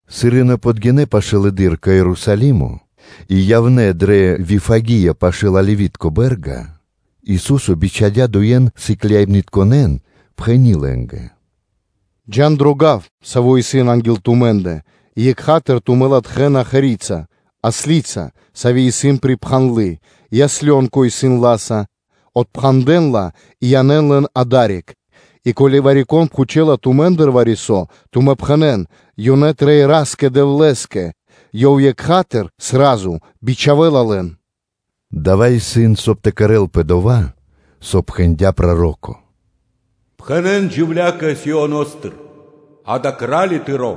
Сыр ёнэ подгинэ́ пашылэды́р кэ Ерусалимо, и явнэ́ дрэ Вифагия пашы́л Оливи́тко (Елеоноскири) бэ́рга, Ису́со бичхадя́ дуе́н сыкляибнытконэ́н, пхэни́ лэ́нгэ: “Джа́н дро гав, саво́ исын анги́л тумэ́ндэ, и екха́тыр тумэ́ латхэ́на ослица́ (мегарица́), сави́ исын припхандлы, и ослёнко исын ла́са; отпхандэн лэн и янэ́н лэн адари́к. И ко́ли вари-кон пхучэла тумэ́ндыр вари-со, тумэ́ пхэнэ́н: ‘Ёнэ трэй Ра́скэ-Дэвлэ́скэ,’ ёв екха́тыр (сра́зу) бичхавэ́ла лэн.” Дава́ исын, соб (кай) тэ кэрэ́лпэ дова́, со пхэндя́ проро́ко: “Пхэнэ́н джувля́кэ Сионо́стыр: ‘А́кэ, Кра́ли тыро́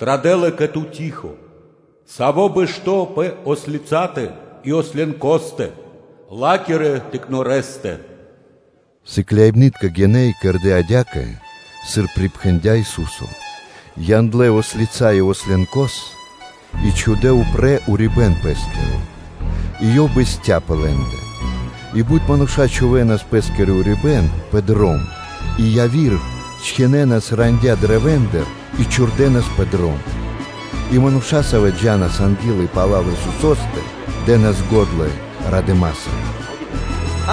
традэ́ла кэ ту, тихо, Саво́ исын бэшто́ пэ ослицатэ и ослёнкостэ, ла́кирэ тыкнорэстэ.’” Сыкляибны́тка гинэ́ и кэрдэ́ адя́кэ, сыр припхэндя́ Ису́со, яндлэ́ ослица и ослёнкос, и чхудэ́ упрэ́ урибэ́н пэ́скиро, и Ёв бэсця́ пэ лэ́ндэ. И бут мануша́ чхувэ́нас пэ́скиро урибэ́н пэ дром, и яви́р счхинэнас рандя́ (вэ́тки) каштэндыр и чхурдэнас пэ дром. И мануша́, савэ́ джа́нас анги́л и пала́л Исусо́стэ, дэ́нас го́дла радыма́са: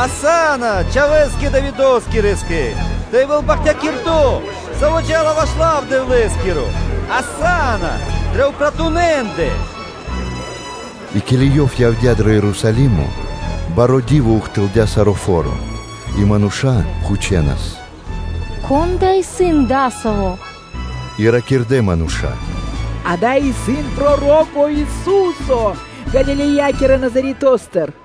“Асанна, Чхавэ́скэ Давидоскирэскэ: тэ явэ́л бахтякирдо́, Саво́ джа́ла ваш лав Дэвлэ́скиро; асанна дрэ упратунэндэ!” И ке́ли Ёв явдя́ дро Ерусалимо, баро́ ди́во ухтылдя саро́ фо́ро и мануша́ пхучэнас: “Кон да исын Адасаво́?” И ракирдэ́ мануша́: “Дава́ исын проро́ко Ису́со Галилеякирэ Назаретостыр.”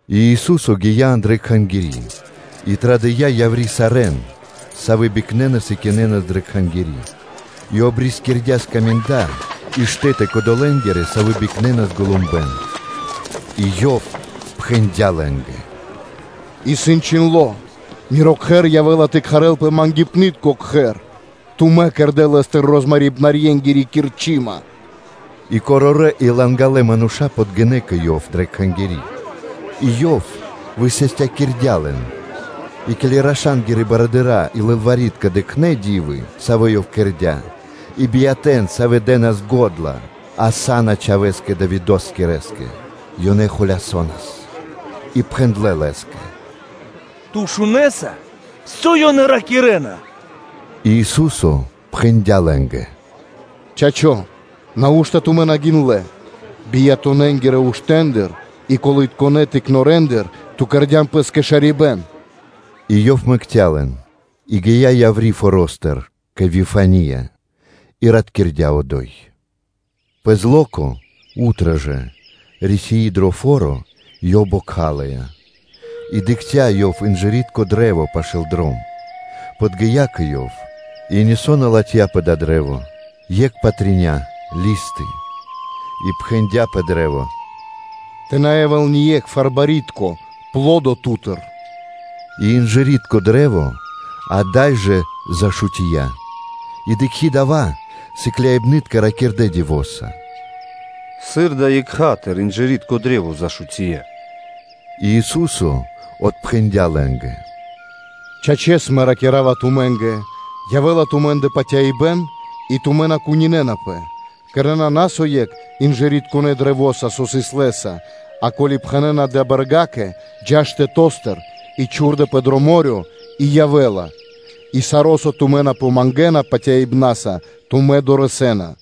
И Ису́со гия́ андрэ́ Кхангири́ и традыя́ яври́ сарэ́н, савэ́ бикнэнас и кинэнас дрэ Кхангири́ и обрискирдя скаминда паруибнарьенгирэ и штэ́ты кодолэнгирэ, савэ́ бикнэнас голумбэн. И Ёв пхэндя́ лэ́нгэ: “Исын чхиндло́: ‘Миро кхэр явэ́ла тэ кхарэлпэ ‘мангипнытко кхэр’: тумэ́ кэрдэ́ лэ́стыр розмарибнарьенгири кирчыма.” И корорэ́ и лангалэ мануша́ подгинэ́ кэ Ёв дрэ Кхангири́, и Ёв высастякирдя́ лэн. И ке́ли раша́нгирэ барыдыра́ и лылвари́тка дыкхнэ́ ди́вы, савэ́ Ёв кэрдя́, и биятэ́н, савэ́ дэ́нас го́дла: “Асанна Чхавэ́скэ Давидоскирэскэ”, ёнэ холясонас, и пхэндлэ́ Лэ́скэ: “Ту шунэса, со ёнэ ракирэ́на?” И Ису́со пхэндя́ лэ́нгэ: “Чачо́! Нау́што тумэ́ на гиндлэ́: бияторэнгирэ уштэндыр и колынытконэ тыкнорэндыр Ту кэрдя́н Пэ́скэ шарибэ́н?’” И Ёв мэкця́ лэн, и гия́ яври́ форо́стыр кэ Вифания и ратькирдя одо́й. Пэ зло́ко жэ, рисии дро фо́ро, Ёв бокхалыя. И дыкхця́ Ёв инжыритко кашт пашы́л дром, подги́я кэ ёв, и нисо́ на латхя́ пэ дава́ кашт (дрэ́во)-екх патря (листы), и пхэндя́ пэ кашт: “Тэ на явэ́л ние́кхвар барьякирдо́ (пло́до) ту́тыр!” И инжыритко кашт ада́й жа зашутия. И дыкхи́ дава́, сыкляибны́тка ракирдэ́ дивоса: “Сыр да екха́тыр (сра́зу) инжыритко кашт зашутия?” И Ису́со отпхэндя́ лэ́нгэ: “Чачэс, Мэ ракира́ва тумэ́нгэ: ко́ли явэ́ла тумэ́ндэ патяибэ́н и тумэ́ на кунинэнапэ, то кэрэ́на на со екх инжыритконэ каштэса, со сыс лэ́са, а, ко́ли пхэнэ́на далэ́ бэргакэ: ‘Джа́ штэто́стыр и чхурдэпэ дро мо́рё (дэрья́в), и явэ́ла’, и саро́, со тумэ́ тэ на помангэн патяибна́са, тумэ́ дорэсэ́на.”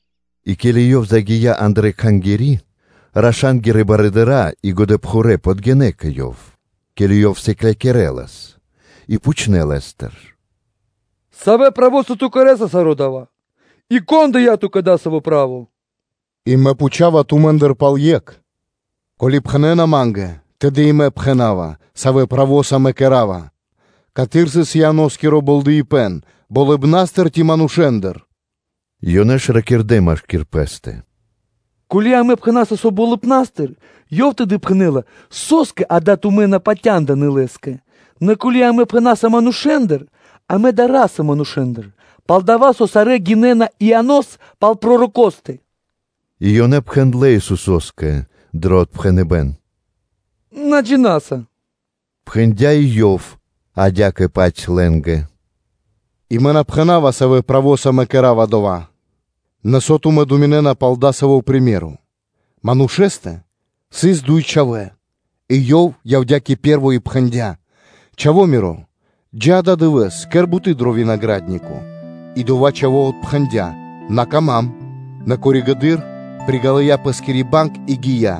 И ке́ли Ёв загия́ андрэ́ Кхангири́, раша́нгирэ барыдыра́ и годэпхурэ́ подгинэ́ кэ Ёв, ке́ли Ёв сыклякирэлас и пхучнэ́ Лэ́стыр: “Савэ правоса Ту кэрэ́са саро́ дава́? И кон дыя́ Ту́кэ дасаво право?” И Мэ пхучава тумэ́ндыр пал екх: “Ко́ли пхэнэ́на Ма́нгэ, тэды и Мэ пхэна́ва, савэ́ правоса Мэ кэра́ва: ‘Каты́р сыс Ианоскиро болдэипэн? Болыбна́стыр, ци манушэ́ндыр?’” Ёнэ ж пириракирдэ машки́р пэ́стэ: “Ко́ли амэ пхэна́са со ‘болыбна́стыр’, Ёв тэды пхэнэ́ла: ‘Со́скэ акэ тумэ́ на патяндынэ́ Лэ́скэ?’ Нэ ко́ли амэ пхэна́са: ‘Манушэ́ндыр’, амэ дара́са манушэ́ндыр; пал-дова́ со сарэ́ гинэ́на Ианос пал пророкостэ” И ёнэ пхэндлэ́ Исусо́скэ дро отпхэныбэ́н: “На джина́са.” Пхэндя и Ёв адя́кэ-паць лэ́нгэ: “И Мэ на пхэна́ва, савэ́ правоса Мэ кэра́ва дава́.” “Нэ со тумэ́ думинэ́на пал дасаво приме́ро (сыкаибэ́н)? Манушэ́стэ сыс дуй чхавэ́, и ёв явдя́ кэ пэ́рво и пхэндя́: “Чхава миро, джа́ ададывэ́с, кэр буты́ дро винагра́днико.” И одова́ чхаво́ отпхэндя́: “На кама́м”, нэ коригэды́р (позжэды́р) приґалыя пэ́скири банг и гия́.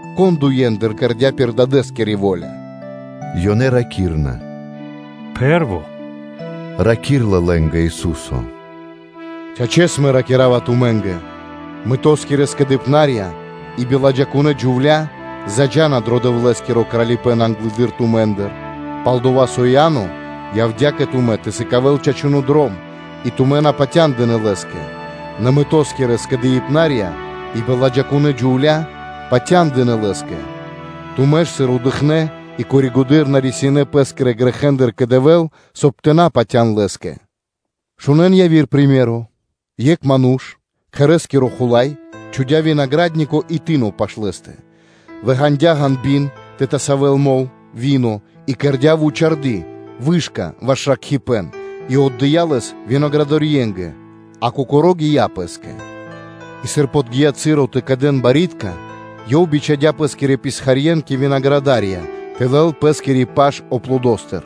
Кон дуендыр кэрдя́ пир дадэ́скири во́ля?” Ёнэ ракирна: “Пэ́рво.” Раки́рла лэ́нгэ Ису́со: “Чачэс, Мэ ракира́ва тумэ́нгэ: ‘Мытоскирэ скэдыибнарья и биладжакунэ́ джувля́ заджа́на дро Дэвлэ́скиро Кралипэ́н англэды́р тумэ́ндыр. Пал-дова́ со Иа́но явдя́ кэ тумэ́ тэ сыкавэ́л чачуно́ дром, и тумэ́ на патяндынэ́ Лэ́скэ; нэ мытоскирэ скэдыибнарья и биладжакунэ́ джувля́ патяндынэ́ лэ́скэ; тумэ́ ж, сыр дыкхнэ́, и коригэды́р на рисинэ́ пэ́скирэ грэхэ́ндыр кэ Дэвэ́л, соб (кай) тэ патя́н Лэ́скэ.’ Шунэ́н яви́р сыкаибэ́н: ‘Екх ману́ш, кхэрэ́скиро хула́й, чхудя́ винагра́днико и тыно пашы́л лэ́стэ, выґанадя ґанби́н тэ тасавэл мол (вино) и кэрдя́ вучарды́ (вышка) ваш ракхибэн и отдыя́ лэс винаградарьенгэ, а кокоро́ гия́ пэ́скэ. И сыр подги́я часо тэ кэдэн барьякирдэ́ (пло́ды), ёв бичхадя́ пэскирэн писхарье́н кэ винаградарья тэ лэл пэ́скири паш аплодостыр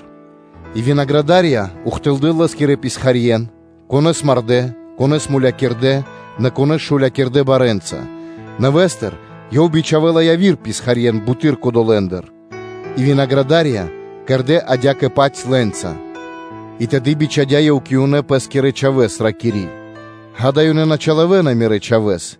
И винаградарья ухтылдэ́ лэ́скирэ писхарье́н: конэ́с мардэ́, конэ́с мулякирдэ́, нэ вари-конэ́с шулякирдэ барэ́нца. Нэвэ́стыр ёв бичхавэ́ла явирэ писхарье́н бутыдыр кодолэндыр, и винаградарья кэрдэ́ адя́кэ-паць лэ́нца. И тэды бичхадя́ ёв кэ ёнэ пэ́скирэ чхавэ́с, ракири́: ‘Акэ, ёнэ на чилавэна мирэ́ чхавэ́с.’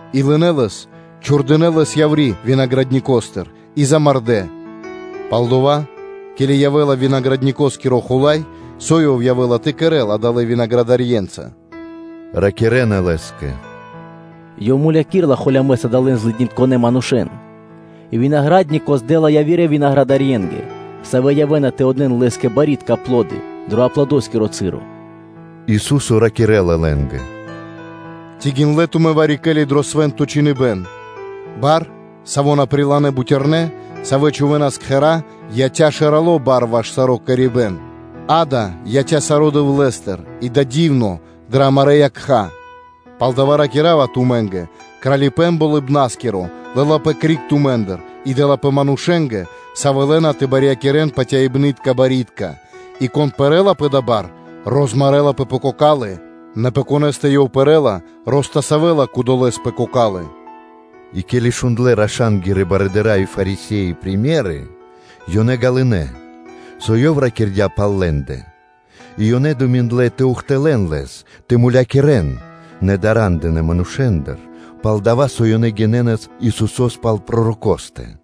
и лынэ́ лэс, чхурдынэ́ лэс яври́ винаградникостыр и замардэ́. Пал-дова́, ке́ли явэ́ла винаградникоскиро хула́й, со ёв явэ́ла тэ кэрэ́л адалэнца винаградарьенца?” Ракирэ́на Лэ́скэ: “Ёв домарэла холямэс адалэн злыднитконэ манушэ́н и винагра́днико здэла явирэ винаградарьенгэ, савэ́ явэ́на тэ отдэ́н лэ́скэ барьякирдэ́ (пло́ды) дро аплодоскиро часо.” Ису́со ракирэ́ла лэ́нгэ: “Ци гиндлэ́ тумэ́ вари-ке́ли дро Свэ́нто Чхиныбэ́н: ‘Бар, саво́ на прилынэ́ бутярнэ́, савэ́ чхувэ́нас кхэра́, яця́ шэралэ́ барэса ваш саро́ кэрибэн: акэ, яця́ саро́ Дэвлэ́стыр, и дава́ исын дивно дрэ амарэ́ якха́?’ Палдава́ ракира́ва тумэ́нгэ: ‘Кралипэ́н Болыбна́скиро лэ́лапэ криг тумэ́ндыр и дэ́лапэ манушэ́нгэ, савэ́ лэ́на тэ барьякирэ́н патяибнытка барьякирдэ́. И кон пэрэ́ла пэ дава́ бар, розмарэлапэ пэ кокалы́, нэ пэ конэ́стэ ёв пэрэ́ла, ростасавэла кодолэ́с пэ кокалы́.’” И ке́ли шундлэ́ раша́нгирэ барыдыра́ и Фарисе́и примеры (сыкаибэна), ёнэ ґалынэ́, со Ёв ракирдя́ пал лэ́ндэ. И ёнэ думиндлэ тэ ухтылэ́н Лэс тэ мулякирэ́н, нэ дара́ндынэ манушэ́ндыр, пал-дова́ со ёнэ гинэнас Исусо́с пал пророкостэ.